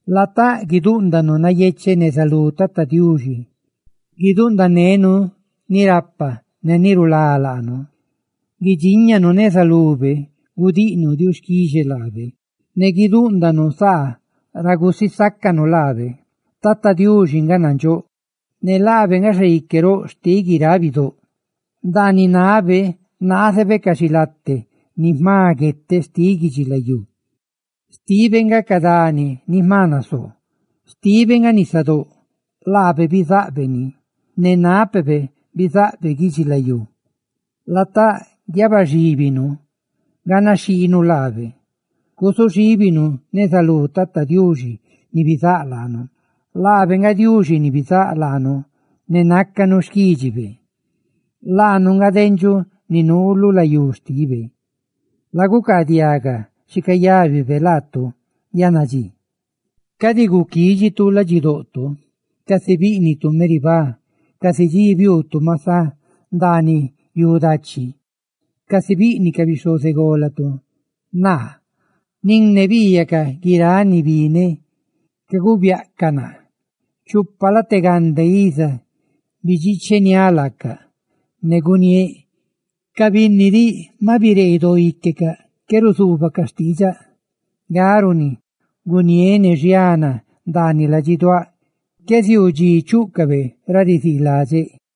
Latáꞌ, guidúꞌndanu nayecheꞌ neza lú Tata Diuxi; guidúꞌndanenu ni rapa ne ni rulá laanu. Guidxíñanu neza lube gudiꞌnu diuxquixe laabe, ne guidúꞌndanu saa ra gusisácanu laabe. Tí Tata Diuxi naca Diuxi nandxóꞌ, ne laabe nga Xaique roꞌ xtiꞌ guiráꞌ bidóꞌ. Ndaaniꞌ nabe naazebe ca xilate ni jma gueteꞌ xtiꞌ guidxilayú; xtibe nga ca dani ni jma nasoo. Xtibe nga nisadóꞌ, laabe bizaꞌbe ni; ¡ne nápebe bizaꞌbe guidxilayú bidxi! Latáꞌ, guiabaxíbinu ganaxhiinu laabe; guzuxíbinu neza lú Tata Diuxi, tí laabe bizaꞌbe laanu. Laabe nga Diuxi ni bizáꞌ laanu, ne nácanu xquídxibe; laanu nga dendxuꞌ ni nuu lu layú xtibe. La gucaadiaga xi cayábibe laatu yannadxí: «Cadi guquidxitu ladxidoꞌto, casi bíꞌnitu Meribá; casi dxi biuutu Masá, ndaaniꞌ yu dachi, casi biꞌniꞌ ca bixhozególatu naa, nin ne biiyacaꞌ guiráꞌ ni bineꞌ caguubiaꞌcaꞌ naa. Chupa late gande iza bidxiicheniáꞌ ca binni que, ne guniéꞌ: "Ca binni diꞌ maꞌ biree doo íquecaꞌ; ¡qué ruzuubacaꞌ xtiidxaꞌ!" Nga runi guniéꞌ ne xiana ndaaniꞌ ladxiduáꞌ qué ziuu dxi chúꞌcabe ra riziiladxeꞌ.»